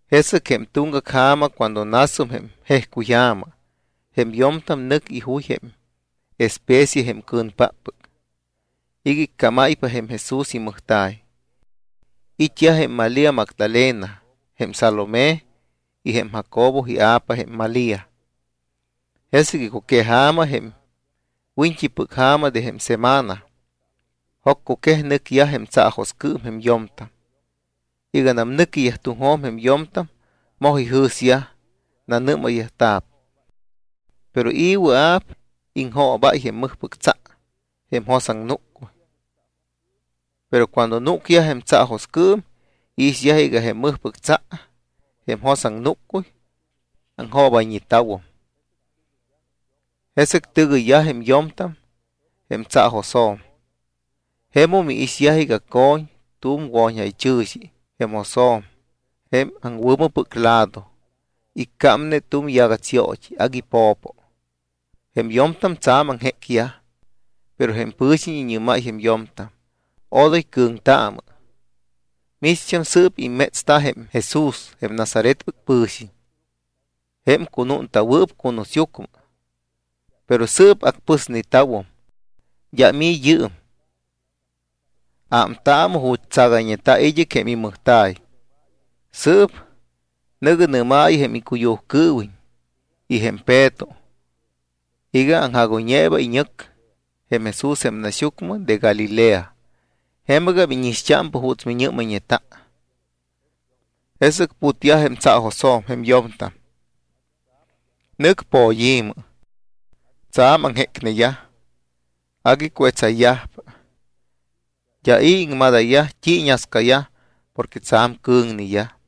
Jesɨc jém tuŋgac ja̱ma cuando nasum jém jejcuyja̱ma, jém yo̱mtam nɨc ijuy jém especia jém cɨ̱npáppɨc iga icámáypa jém Jesús imɨjta̱y. It́yaj jém Malía Magdalena, jém Salomé y jém Jacobo ia̱pa jém Malía. Jesɨc icuqueja̱ma, jém wiñt́ipɨc ja̱ma de jém semana, joccuquej, nɨcyaj jém tsaajoscɨɨm jém yo̱mtam. Iganam nɨquiyaj tuŋjo̱m jém yo̱mtam moj ijɨ̱syaj, nanɨ́mayyajta̱p: —¿Pero i̱ wɨa̱p iŋjoobáy jém mɨjpɨc tsa, jém jos aŋnúccuy? Pero cuando núcyaj jém tsaajoscɨɨm iixyaj iga jém mɨjpɨc tsa, jém jos aŋnúccuy, aŋjoobayñeta̱wum. Jesɨc tɨgɨyyaj jém yo̱mtam jém tsaajosjo̱m. Jemum iixyaj iga co̱ñ tu̱m wo̱ñjaychɨ̱xi jém josjo̱m jém aŋwɨ̱mɨpɨc lado. Iccámne tu̱m yagats yoot́i agui po̱po. Jém yo̱mtam tsa̱m aŋjécyaj. Pero jém pɨ̱xiñ iñɨ́máy jém yo̱mtam: —Odoy cɨ̱ŋtaamɨ. Micht́am sɨ́p immétsta jém Jesús, jém Nazaretpɨc pɨ̱xiñ, jém cunúnta̱wɨɨp cunusyucmɨ. Pero sɨɨp acpɨsneta̱wum. D́am i̱ yɨɨm. Ámtaamɨ ju̱t́ tsagayñeta̱ id́ɨc jém imɨjta̱y. Sɨɨp nɨ̱gɨ nɨ́maayɨ jém icuyujcɨɨwiñ y jém Peto iga: “Aŋjagóypa iñɨc jém Jesús jém naxyucmɨ de Galilea. Jemɨgam íñixt́ámpa juuts miñɨ́mayñeta.” Jesɨc putyaj jém tsaajosjo̱m jém yo̱mtam. Nɨc poyi̱mɨ. Tsa̱m aŋjécneyaj. Agui cuetsayyajpa. D́a i̱ iŋmadayyaj t́i iñascayaj porque tsa̱m cɨ̱ŋneyaj.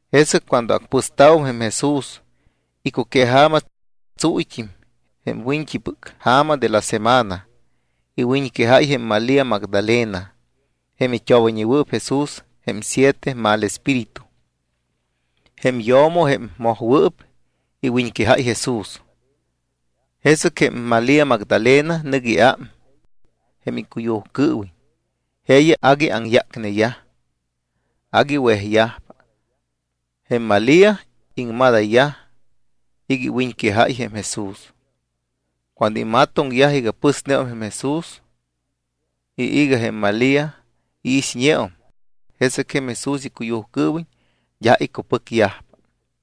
Jesɨc cuando acpɨsta̱wum jém Jesús, icuqueja̱ma, tsuuyt́im, jém wiñt́ipɨc ja̱ma de la semana, iwiñquejáy jém Malía Magdalena, jém it́obayñewɨɨp Jesús jém siete mal espíritu. Jém yo̱mo jém mojwɨɨp iwiñquejáy Jesús. Jesɨc jém Malía Magdalena nɨc iám jém icuyujcɨɨwiñ. Jeeyaj agui aŋyácneyaj, agui wejyajpa. Jém Malía iŋmadayyaj iga iwiñquejayñe jém Jesús. Cuando imatoŋyaj iga pɨsneum jém Jesús y iga jém Malía iixñeum, jesɨc jém Jesús icuyujcɨɨwiñ d́a icupɨcyajpa.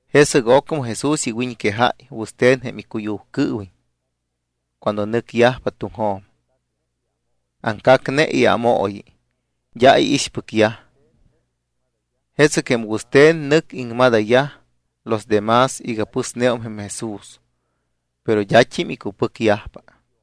Jesɨc ocmɨ Jesús iwiñquejáy wɨste̱n jém icuyujcɨɨwiñ cuando nɨcyajpa tuŋjo̱m. Aŋcacne iámooyi. D́a iixpɨcyaj. Jesɨc jém wɨste̱n nɨc iŋmadayyaj los de más iga pɨsneum jém Jesús, pero d́at́im icupɨcyajpa.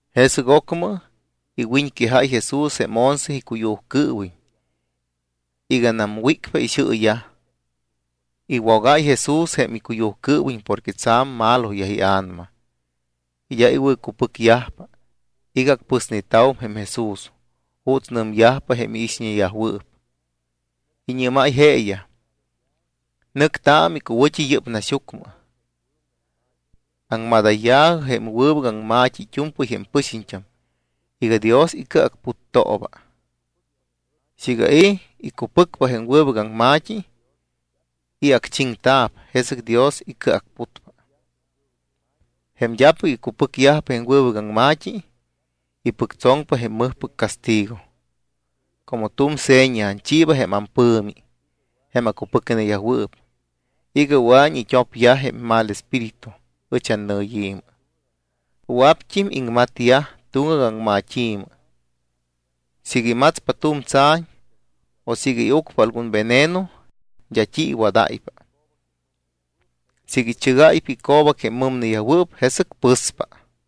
Jesɨc ocmɨ iwiñquejáy Jesús jém once icuyujcɨɨwiñ iganam wícpa ixɨɨyaj. Iwogáy Jesús jém icuyujcɨɨwiñ porque tsa̱m maloyaj ia̱nama y d́a icupɨcyajpa iga acpɨsneta̱wum jém Jesús juuts nɨmyajpa jém iixñeyajwɨɨp. Iñɨ́máy jeeyaj: —Nɨctaamɨ icuwɨ̱t́i yɨ́p naxyucmɨ. Aŋmadayya̱jɨ jém wɨbɨc aŋma̱t́i it́u̱mpɨy jém pɨxiñt́am iga Dios icɨacputtooba. Siiga i̱ icupɨcpa jém wɨbɨc aŋma̱t́i y acchiŋta̱p, jesɨc Dios icɨacputpa. Jém d́apɨc icupɨcyajpa jém wɨbɨc aŋma̱t́i, ipɨctsoŋpa jém mɨjpɨc castigo. Como tu̱m seña anchiiba jém ampɨ̱mi jém acupɨcneyajwɨɨp iga wɨa̱iñ it́opyaj jém mal espíritu ɨch annɨyi̱mɨ. Wɨa̱pt́im iŋmatyaj tuŋgac aŋmat́i̱mɨ. Siiga imatspa tu̱m tsa̱ñ o siiga iucpa algun veneno, d́a t́i iwadáypa. Siiga ichɨgáypa ico̱bac jém mɨmneyajwɨɨp, jesɨc pɨspa.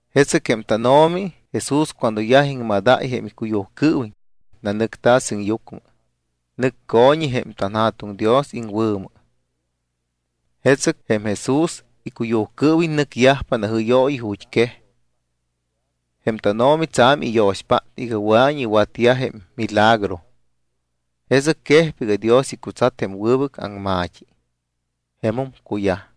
Jesɨc jém tánO̱mi Jesús cuando yaj iŋmadáy jém icuyujcɨɨwiñ, nanɨcta̱ sɨŋyucmɨ, nɨc co̱ñi jém tanJa̱tuŋ Dios iŋwɨ̱mɨ. Jesɨc jém Jesús icuyujcɨɨwiñ nɨcyajpa najɨ́yooyi ju̱t́quej. Jém tánO̱mi tsa̱m iyo̱xpát iga wɨa̱iñ iwatyaj jém milagro. Jesɨc quejpa iga Dios icutsat jém wɨbɨc aŋma̱t́i. Jemum cuyaj.